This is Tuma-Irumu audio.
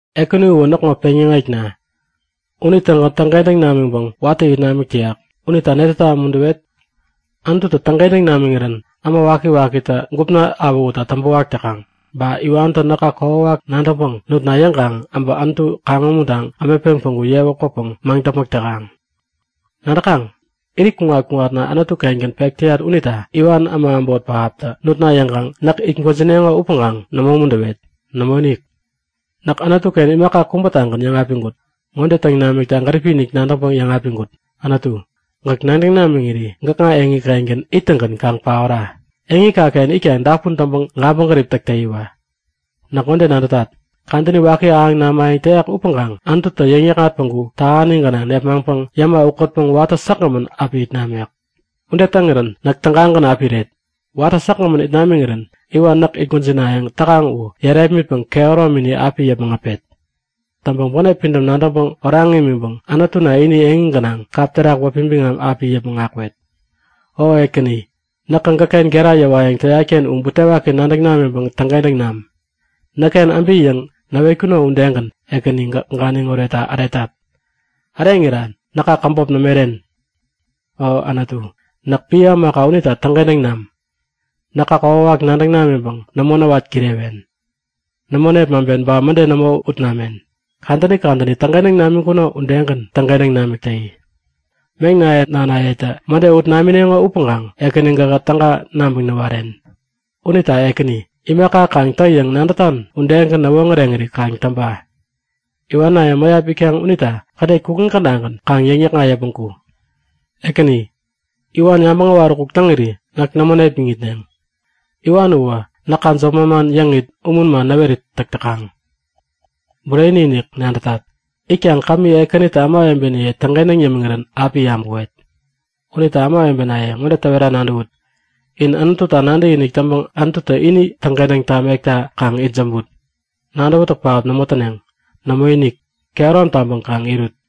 Ekäni uwä näkŋo peŋyäŋekna. Unitägän täŋkentäŋ namiŋpäŋ watä it namik täyak. Unita netäta umuntäwet? Anututä täŋkentäŋ namiŋirän äma wakiwakitä gupna awähutta täŋpäwak täkaŋ. Ba iwantä näka kokwawak nadäŋpäŋ nutna yäŋkaŋ äbä Anutu kaŋ-umuntaŋ ämetpeŋ päŋku yewä kwäpäŋ maŋdäpmäk täkaŋ. Nadäkaŋ? Irit kuŋat-kuŋatna Anutu-kengän pek täyat unita iwan äma äbot pähaptä nutna yäŋkaŋ näk it gwäjineŋo upäŋkaŋ nämo umuntäwet. Nämoinik! Näk Anutuken imaka kubätagän yäŋapiŋkut. Ŋode täŋ namikta gäripi-inik nadäŋpäŋ yäŋapiŋkut; Anutu, gäk nadäŋ namiŋiri gäkŋa eŋi-kengän ittäŋgän kaŋ paora. Eŋikaken itkaŋ dapun täŋpäŋ gabäŋgärip täk täyiwa. Näk ŋode nadätat; Kadäni waki ahäŋ namayäŋ täyak upäŋkaŋ Anututä yäŋnäkŋat päŋku tähani gänaŋ nepmaŋpäŋ yäma ukätpäŋ watä säkgämän api it namek. Ude täŋirän näk tägagän api iret. Watä säkgämän it namiŋirän iwan näk it gwäjinayäŋ täkaŋ u yärepmitpäŋ kehäromini api yäpmäŋ äpet. Täŋpäŋ bänep pidäm nadäŋpäŋ oraŋ imiŋpäŋ Anututä ini eŋi gänaŋ kap terak wäpi biŋam api yäpmäŋ akwet. O Ekäni, näkä gäkken gera yäwayäŋ täyatken u butewaki nadäŋ namiŋkaŋ täŋkentäŋ nam. Näkken äbi yäŋ näwetkuno udegän Ekäni, gäk ganiŋ oretta äretat. Äreŋira näka käbop nämo iren. O Anutu, näk piä ämaka unita täŋkentäŋ nam! Näka kokwawak nadäŋ namiŋpäŋ nämo näwat kirewen. Nämo nepmaŋpen ba mäde nämo ut namen. Kadäni kadäni täŋkentäŋ namik täŋkuno udegän täŋkentäŋ namik täyi. Meŋnaye nanayetä mäde ut namineŋo upäŋkaŋ Ekäni gähä täga nabäŋ näwaren. Unita Ekäni, imaka kaŋ tä yäŋ nadätan udegän näwoŋäreŋiri kaŋ täŋpa. Iwanaye mäyap itkaŋ unita kädet kukŋi kädagän kaŋ yäŋnäkŋat yäpmäŋ ku. Ekäni, iwan yabäŋ äwaräkuk täŋiri näk nämo nepmäŋitneŋ. Iwan uwä näka jop manman yäŋit umun man näwerit täk täkaŋ. Bureni-inik nadätat! Itkaŋ kämi Ekänitä ämawebeniye täŋkentäŋ yämiŋirän api yabäwet. Unita ämawebenaye, ŋode täwera nadäwut; In Anututa nadäkinik täŋpäŋ Anututä ini täŋkentäŋ tamekta kaŋ itsämbut. Nadäwätäk pähap nämo täneŋ. Nämoinik! Kehärom taŋpäŋ kaŋ irut.